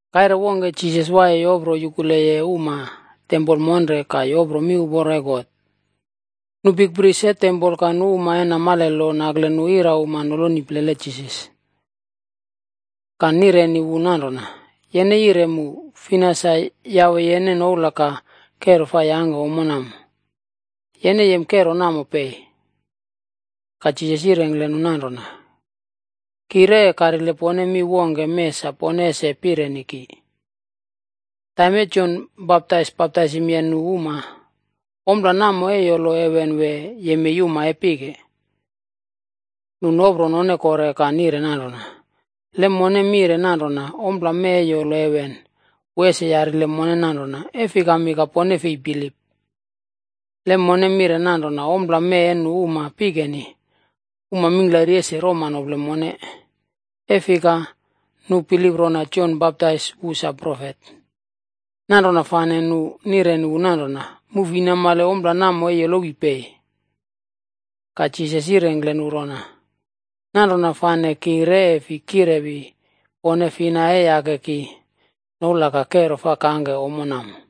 Kaire wongke, Jisas waiye yopro yukule uma tempol monre ka yopro miuporo e God, nu bikpris e tempol ka nu uma e namale lo, nakle nu irauma noloni plele Jisas. Ka nireni wu nanrona, “Yene yire mu, fina sa yawe yene noula ka kero fa yangke ommo namo? Yene yem kero namo pei?” Ka Jisas yirengkle nu nanrona, “Ki re e karile pone mi wongke mee sa pone ese pireni ki. Taim e Jon Baptais baptaisimye nu uma, ompla namo e yolo heven wee, yemei uma e pike?” Nu nopro none kore ka nire nanrona, “Le mone mire nanrona, ‘Ompla mee e yolo heven,’ wu ese yarile mone nanrona, ‘E fikami ka pone fei bilip?’ Le mone mire nanrona, ‘Ompla mee e nu uma pikeni,’ uma mingklari ese roma nople mone, e fika, nu bilip rona Jon Baptais wu sa profet.” Nanrona fane nu nireni wu nanrona, “Mu fi namale ompla namo e yolowi pei.” Ka Jisas yirengkle nu rona, “Nanrona fane ki re e fi kirewi pone fina e yake ki noula ka kero fa kangke ommo namo.”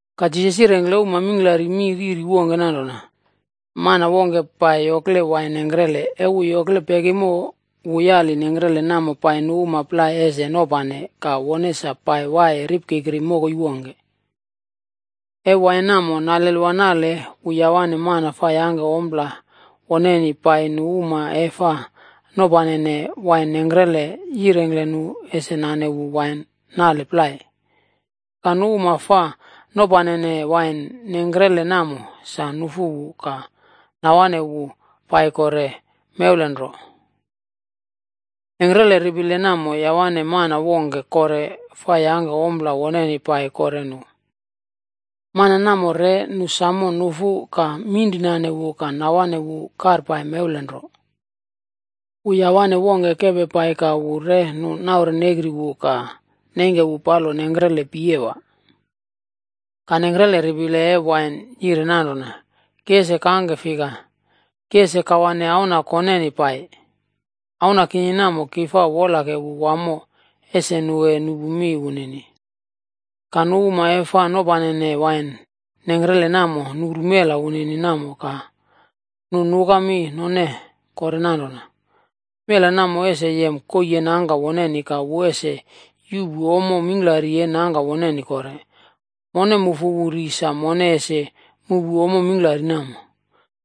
Ka Jisas yirengkle uma mingklari mi riri wongke nanrona, “Mana wongke pai yokle wain nengkrele. E wu yokle pekimo, wu yali nengkrele namo pai nu uma plai ese nopane ka wone sa pai waiye ripkikri mokoi wongke. E wain namo nalelwa nale wu yawane mana fa yangke ompla woneni pai nu uma e fa nopanene wain nengkrele yirengkle nu ese nane wu wain nale plai. Ka nu uma fa nopanene wain nengkrele namo sam nufu wu ka nawane wu pai kore mewlen nro. Nengkrele ripile namo yawane mana wongke kore fa yangke ompla woneni pai kore nu. Mana namo re nu sam nufu ka minrinane wu ka nawane wu karpai mewlen nro. Wu yawane wongke kepe pai ka wu re nu naurnekri wu ka neingke wu palo nengkrele piyewa. “Ka nengkre ripile e wain yire nanrona, ‘Ki ese kangke fika? Ki ese kawane auna koneni pai. Auna kinini namo ki fa wolake wu wamo, ese nu e nupu mi wunini.’ “Ka nu uma e fa nopanene wain nengkrele namo nuru mela wunini namo ka nu nuka mi none kore nanrona, ‘Mela namo ese yem koii e nangka woneni ka wu ese yuꞌpu ommo mingklari e nangka woneni kore. Mon mufu wu ri sa mone ese muꞌpu ommo mingklari namo.’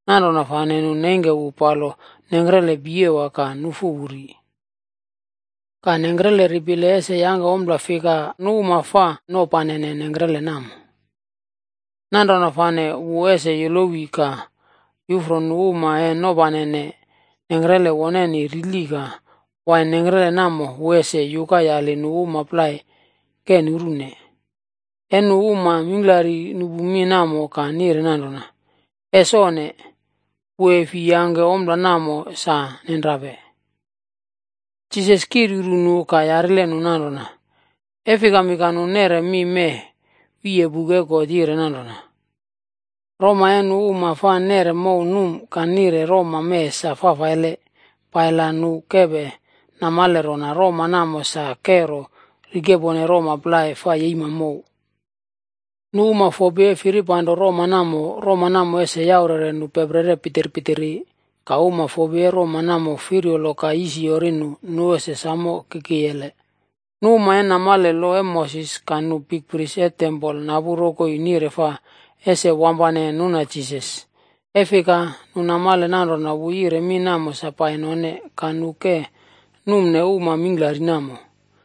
Nanrona fane nu neingke wu palo nengkrele piyewa ka nufu wu ri. “Ka nengkrele ripile ese yangke ompla fika nu uma e fa nopanene nengkrele namo? Nanrona fane wu ese yolowi ka yuꞌfro nu uma e nopanene nengkrele woneni rili ka wain nengkrele namo wu ese yuka yali nu uma plai ke nurune.” E nu uma mingklari nupu mi namo ka nire nanrona, “Es onne! Wu e fi yangke ompla namo sa nenrape.” Jisas kiryuru nu ka yarile nu nanrona, “E fikami ka nu neꞌre mi mee wiye buk e God yire nanrona, ‘Roma e nu uma fa neꞌre mow num ka nire roma mee sa fafaile pai la nu kepe namale rona, roma namo sa kero rikepone roma plai fa yeima mow.’? Nu uma fopi e firipanro roma namo, roma namo ese yaurere nu peprere pitirpitiri. Ka uma fopi e roma namo firyolo ka yisoro nu, nu ese sam kikiyele.” Nu uma e namale lo e Moses ka nu bikpris e tempol napu rokoi nire fa ese wampane nuna Jisas, e fika nu namale nanrona wu yire mi namo sa pai none. Ka nu ke numne uma mingklari namo.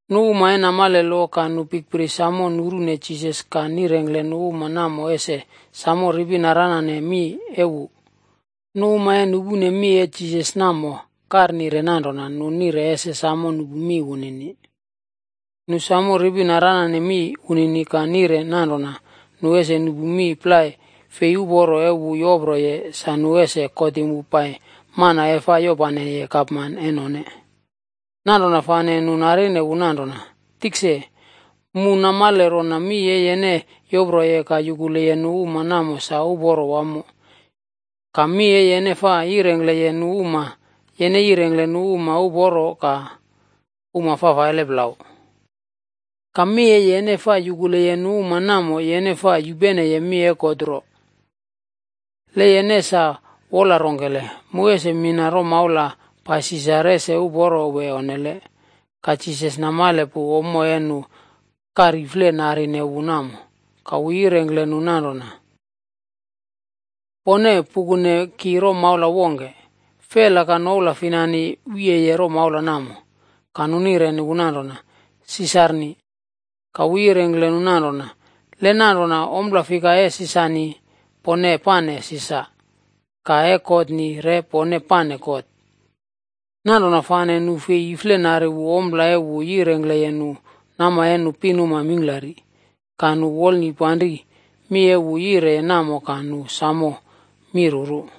Nu uma e namale lo ka nu bikpris samo nurune Jisas ka nirengkle nu uma namo ese sam ripi naranane mi e wu. Nu uma e nupune mi e Jisas namo karnire nanrona, nu nire ese samo nupu mi wunini. Nu samo ripi naranane mi wunini ka nire nanrona nu ese nupu mi plai fei uporo e wu yoproye sa nu ese kotim wu pai mana e fa yopaneye gapman e none. Nanrona fane nu narine wu nanrona, “Tikse, mu namale rona mi e yene yoproye ka yukuleye nu uma namo sa uporo wamo. Ka mi e yene fa yirengkleye nu uma, yene yirengkle nu uma uporo ka uma fafaile plau. Ka mi e yene fa yukuleye nu namo, yene fa yupene mi e God nro. Le yene sa wola rongkele, mu ese mina romaula pai Sisar, ese uporo wee onnele?” Ka Jisas namale pu, ommo e nu karifle narine wu namo, ka wu yirengkle nu nanrona, “Pone pukune ki romaula wongke. Fela ka noula finani wiyeye romaula namo?” Ka nu nireni wu nanrona, “Sisarni.” Ka wu yirengkle nu nanrona, “Le nanrona, ompla fika e Sisarni, pone pane Sisar, ka e Godni re pone pane God.” Nanrona fane nu fei iflenari wu ompla e wu yirengkleye nu nama e nu pinuma mingklari. Ka nu wolnipanri mi e wu yire namo ka nu samo mi ruru.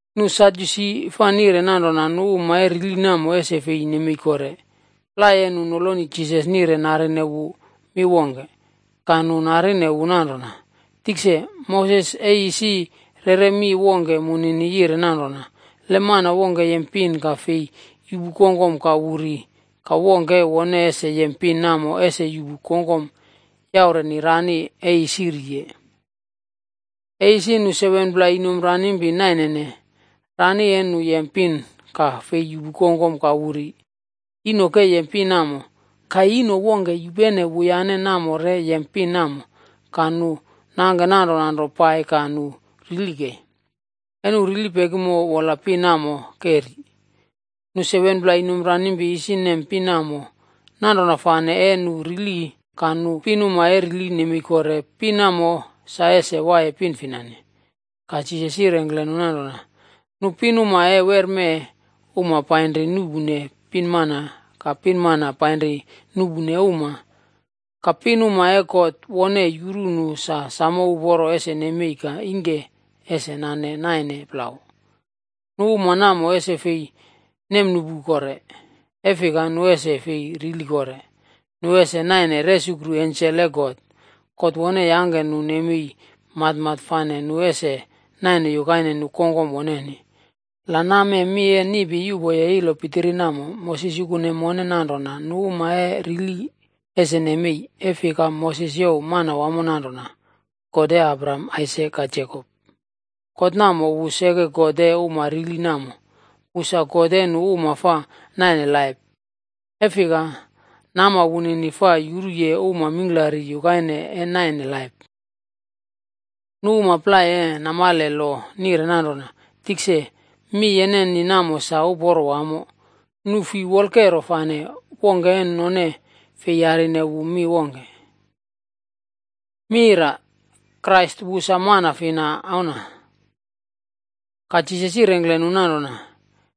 Nu Sadyusi fa nire nanrona nu uma e rili namo ese fei nemei kore. Plai e nu noloni Jisas nire narine wu mi wongke. Ka nu narine wu nanrona, “Tikse, Moses e isi reꞌre mi wongke munini yire nanrona, ‘Le mana wongke yem pin ka fei yuꞌpu kongkom ka wu ri, ka wongke e wone ese yem pin namo ese yuꞌpu kongkom yaureni rani e isi riye.’ E isi nu 7pla inomp ranimpi nainene. Rani e nu yem pin ka fei yuꞌpu kongkom ka wu ri. Ino ke yem pin namo. Ka ino wongke yupene wuyane namo re yem pin namo, ka nu nangke nanrona nro pai ka nu rili kei. E nu rili pekimo, wola pin namo ke ri. Nu 7-pla inomp ranimpi isi nem pin namo, nanrona fane e nu rili ka nu pinuma e rili nemei kore, pin namo sa ese waiye pin finani?” Ka Jisas yirengkle nu nanrona, “Nu pinuma e werme, uma painri nuꞌpune pinmana ka pinmana painri nuꞌpune uma. Ka pinuma e God wone yuru nu samo uporo ese nemei kore ka ingke ese nane naine plau, nu uma namo ese fi nemnuꞌpu kore. E fika nu ese fi rili kore. Nu ese naine resukru ensel e God. God wone yangke nu nemei matmat fane nu ese naine yukaine nu kongkom woneni. La namee mi e niꞌpi yuꞌpoye ilo pitiri namo, Moses yukune mone nanrona nu uma e rili ese nemei, e fika, Moses youw Manawamo nanrona, ‘God e Abraham, Aisak ka Jekop.’ God namo, wu seke God e uma rili namo. Wu sa God e nu uma fa naine laip, e fika nama wunini fa yuruye uma mingklari yukaine e naine laip.” Nu uma plai e namale lo nire nanrona, “Tikse, mi yeneni namo sa uporo wamo.” Nu fi wolkero fane wongke e none fei yarine wu mi wongke. Krais wu sa man fina auna? Ka Jisas yirengkle nu nanrona,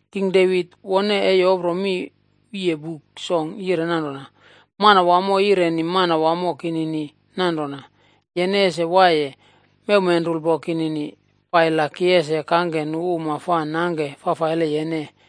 King Devit wone e yopro mi wiye Buk Song yire nanrona: ‘Manawamo e yireni Manawamo kinini nanrona, “Yene ese waiye mewmenrulpo kinini, pai la ki ese kangke nu uma fa nangke fafaile yene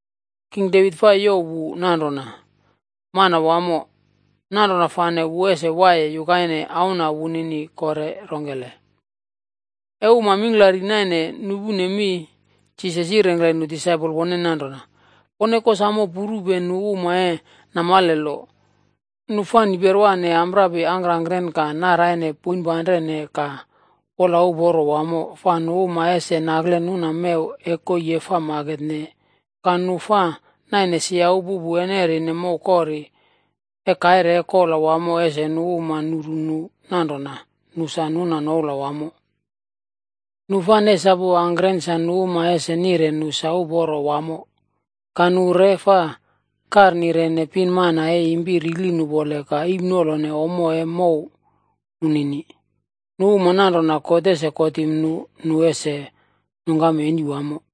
King Devit fa youw wu nanrona, ‘Manawamo.’ Nanrona fane wu ese waiye yukaine auna wunini kore rongkele?” E uma mingklari naine nupune mi, Jisas yirengkle nu disaipol woneni nanrona, “Pone kosamo purupe nu uma e namale lo. Nu fa niperwane amprapi angkangkren ka naraine poinpanrene ka wola uporo wamo, fa nu uma ese nakle nuna mew e koii e fa maketne, ka nu fa naine sia upupu e nerine mow kori, e kaire e kola wamo ese nu uma nuru nu nanrona, nu sa nuna noula wamo. Nu fa nesapu angkren sa nu uma ese nire nu sa uporo wamo, ka nu re fa karnirene pinmana e impi rili nupole ka iimnolone ommo e mow nunini. Nu uma nanrona, God ese kotim nu, nu ese nungkam eni wamo.”